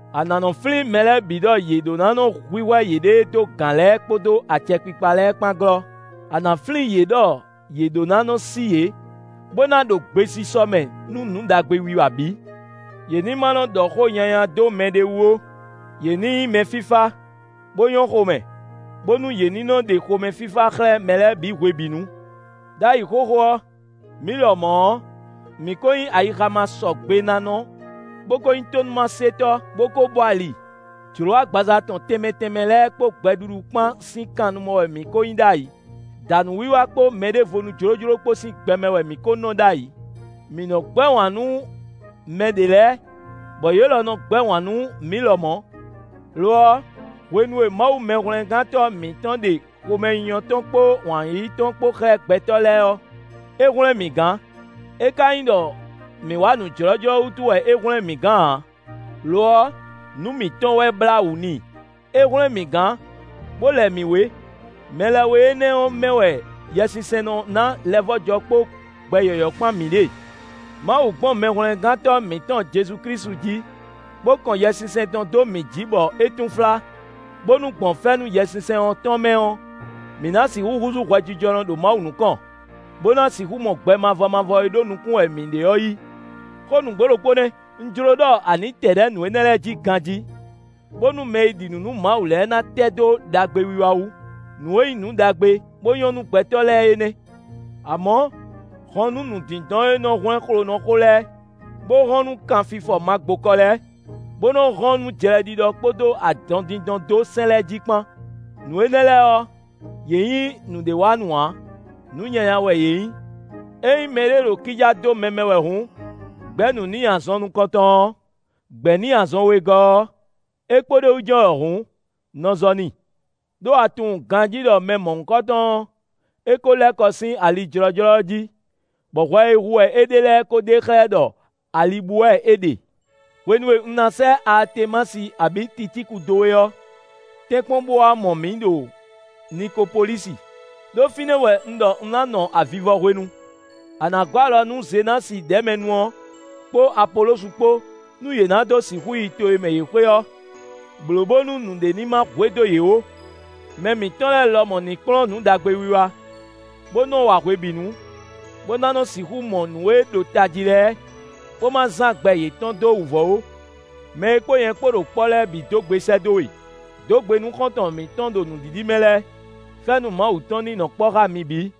A nǎ nɔ́ flín mɛ lɛ́ɛ bǐ ɖɔ yě ɖó ná nɔ́ hwíhwɛ́ yěɖée dó gǎn lɛ́ɛ kpódó acɛkpikpa lɛ́ɛ kpán glɔ́; a nǎ flín yě ɖɔ yě ɖó ná nɔ sí yě, bó ná ɖo gbesisɔ mɛ nú nǔ ɖagbe wiwa bǐ. Yě ní ma nɔ ɖɔ xó nyanya dó mɛɖé wú ó; yě ní nyí mɛfífá, bó nyɔ́ xomɛ, bónú yě ní nɔ ɖe xomɛfífá xlɛ́ mɛ lɛ́ɛ bǐ hwebǐnu. Đó ɖ'ayǐ xóxó ɔ́, mǐ lɔmɔ̌ ɔ́, mǐ ko nyí ayixamasɔgbenánɔ, bó kó nyí tónúmasetɔ́, bó kó bú ali; jlǒ agbaza tɔn tɛnmɛ tɛnmɛ lɛ́ɛ kpó gbɛɖuɖu kpán sín kannumɔ wɛ mǐ kó nyí ɖ'ayǐ. Dǎnúwiwa kpó mɛɖěvonújlójló kpó sín gbɛ mɛ wɛ mǐ kó nɔ ɖ'ayǐ; mǐ nɔ gbɛ́ wǎn nú mɛ ɖě lɛ́ɛ, bɔ yě lɔ nɔ gbɛ́ wǎn nú mǐ lɔmɔ̌. Lo ɔ́, hwenu e Mawu Mɛhwlɛ́ngántɔ́ mǐtɔn ɖe xomɛnyínyɔ́ tɔn kpó wǎn yíyí tɔn kpó xlɛ́ gbɛtɔ́ lɛ́ɛ ɔ́, é hwlɛ́n mǐ gán, é ka nyí ɖɔ mǐ wa nǔ jlɔ́jlɔ́ wútu wɛ é hwlɛ́n mǐ gán ǎ; lo ɔ́, nǔ mǐtɔn wɛ blá wǔ n'i. É hwlɛ́n mǐ gán, bó lɛ mǐ wé; mɛlɛwé énɛ́ ɔ́ mɛ wɛ Yɛsinsɛn nɔ ná lɛ̌vɔ́jɔ kpó gbɛ yɔ̌yɔ́ kpán mǐ ɖe. Mawu gbɔn Mɛhwlɛ́ngántɔ́ mǐtɔn Jezu Klísu jí, bó kɔn Yɛsinsɛn tɔn dó mǐ jí bɔ é túnflá, bónú gbɔn fɛ́nú Yɛsinsɛn ɔ́ tɔn mɛ ɔ́, mǐ ná sixú húzú hwɛjijɔnɔ ɖo Mawu nukɔn, bó ná sixú mɔ gbɛ mavɔ mavɔ e ɖó nukún wɛ mǐ ɖe ɔ́ yí. Xó nǔgbó ɖokpó nɛ́. Un jló ɖɔ a nǐ tɛ ɖɛ̌ nǔ énɛ́ lɛ́ɛ jí ganjí, bónú mɛ e ɖi nǔ nú Mawu lɛ́ɛ ná tɛ́ dó ɖagbewiwa wú. Nǔ e nyí nǔ ɖagbe bó nyɔ́ nú gbɛtɔ́ lɛ́ɛ é nɛ́. Amɔ̌, hɔn nú nǔdindɔn e nɔ hwɛ́n xlonɔ xó lɛ́ɛ, bó hɔn nú kanfifɔ magbokɔ lɛ́ɛ, bó nɔ hɔn nú jlɛɖiɖɔ kpódó adɔndindɔn dó sɛ́n lɛ́ɛ jí kpán. Nǔ énɛ́ lɛ́ɛ ɔ́, yě nyí nǔɖéwanú ǎ; nǔ nyanya wɛ yě nyí. Ényí mɛɖé ɖo kíjá dó mɛ mɛ wɛ hǔn, gbɛ̌ nǔ n'i azɔn nukɔntɔn ɔ́, gbɛ́ n'i azɔn wegɔ́ ɔ́; é kpo ɖ'é wú jɛ́n wɛ hǔn, nɔ zɔ n'i. Đó a tunwun ganjí ɖɔ mɛ mɔ̌hunkɔtɔn ɔ́, é ko lɛ́ kɔ sín ali jlɔ́jlɔ́ ɔ́ jí, bɔ hwɛ e hu wɛ é ɖe lɛ́ɛ ko ɖe xlɛ́ ɖɔ ali bú wɛ é ɖe. Hwenu e un ná sɛ́ Aatemási abǐ Ticíku dó we ɔ́, tɛ́nkpɔ́n bó wá mɔ mǐ ɖo Nikopolísi, ɖó fínɛ́ wɛ un ɖɔ un ná nɔ avivɔ hwenu. A nǎ gɔ́ alɔ nú Zenasi ɖɛ̌mɛnu ɔ́, kpó Apolosu kpó, nú yě ná dó sixú yi to e mɛ yě xwe ɔ́; blǒ bónú nǔɖé ní ma hwedó yě ó. Mɛ mǐtɔn lɛ́ɛ lɔmɔ̌ ní kplɔ́n nǔ ɖagbe wiwa, bó nɔ wa hwebǐnu, bó ná nɔ́ sixú mɔ nǔ e ɖo tají lɛ́ɛ, bó ma zán gbɛ yětɔn dó wǔvɔ́ ó. Mɛ e kpó nyɛ kpó ɖo kpɔ́ lɛ́ɛ bǐ dó gbe sɛ́ dó we. Dǒ gbe nú xɔ́ntɔn mǐtɔn ɖo nǔɖiɖi mɛ lɛ́ɛ. Fɛ́nú Mawu tɔn ní nɔ kpɔ́ xá mi bǐ.